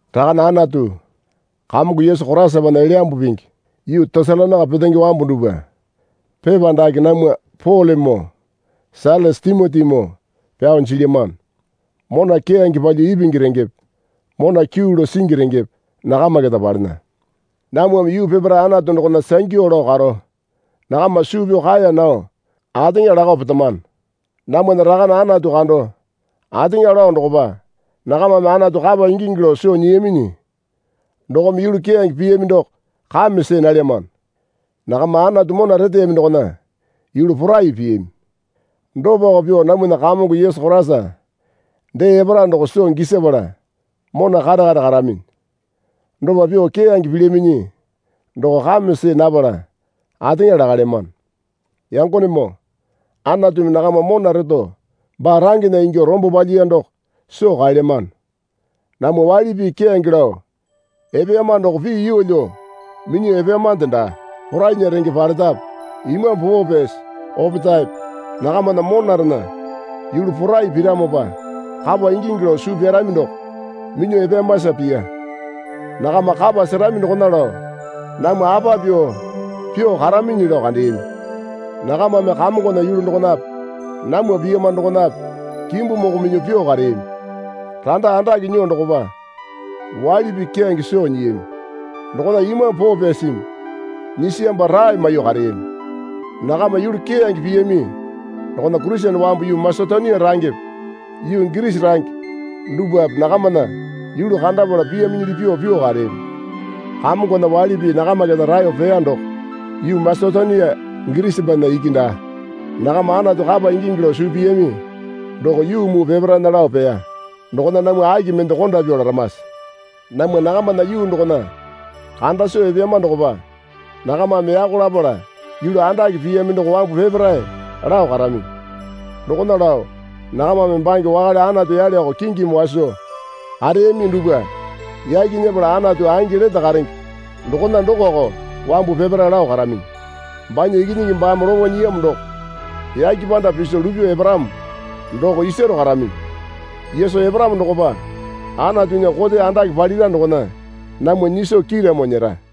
Rakane Anatu, Kamongo Yesu Koraisapana Elyambu Pingi yuu Tesalonaika petenge wambu dupwa pepa dake namwa Polemoo Sailasa Timotimoo pyao jilyamano. Mona keyange palyuo ipingi rengepe mona kyuu lao singi rengepe nakama keta palena. Namwame yuu peparae Anatu dokona sangyu lao karo nakama suu pyao kaeya nao ateŋa lakao petamano. Namwana Rakane Anatu kando ateŋa lao dokopa nakamame Anatu kapa ingingi lao soo nyiyaminyi dokome yulu keyange piyami doko kame see nalyamano. Nakama Anatu mona reteyami dokona yulu porai piyami. Dopako pyuo namwana Kamongo Yesu Koraisa dee epara doko soo gisapala mona kare kare karaminyi. Dopa pyuo keyange pilyaminyi doko kame see napala ateŋa lakalyamano. Yangonemoo, Anatumi nakama mona reto baa rangena ingyuo rombo palyiya doko soo kaelyamano. Namwa waili pii keyange lao epeyama doko pii yeelyo minyuo epeyamande daa. Porainya renge paletape Imambu Poo Pyasi opetaepe nakamana monarena yulu porai piramopa kapa ingingi lao suu pyarami doko minyuo epeyamasa piya. Nakama kapa serami dokona lao namwa apa pyuo pyuo karaminyi lao kandeyami. Nakamame Kamongona yulu dokonape namwa piyama dokonape kimbu moko minyuo pyuo kareyami. Randa andake nyuo dokopa waili pii keyange soo nyiyami. Dokona Imambu Poo Pyasimi nyisiyamopa rae maiyuo kareyami. Nakama yulu keyange piyami dokona Kurisene wambu yuu Masetonia rangepe yuu Girisi range dupwape nakamana yulu kandapala piyaminyili pyuo pyuo kareyami. Kamongona waili pii nakama keta raeyo peya doko yuu Masetonia Girisipana iki daa. Nakama Anatu kapa ingingi lao suu piyami doko yuu muu peparaena lao peya. Dokona namwa aki mende konda pyuo laramase? Namwa nakamana yuu dokona kanda soo epeyama dokopa nakamame yako lapala yulu andake piyami doko wambu peparae lao karaminyi. Dokona lao nakamame bange wakale anatu yaleoko kingimi waso kareyami dupwa yaki nyepala Anatu angi lete karenge dokona dokoko wambu peparae lao karaminyi. Banya Ikinyingi baame lopo nyiyamo doko yake panda piso lupyuo eparamo doko isaro karaminyi. Yesu eparamo dokopa Anatunya kote andake palira dokona namwa nyiso kiiramo nyera.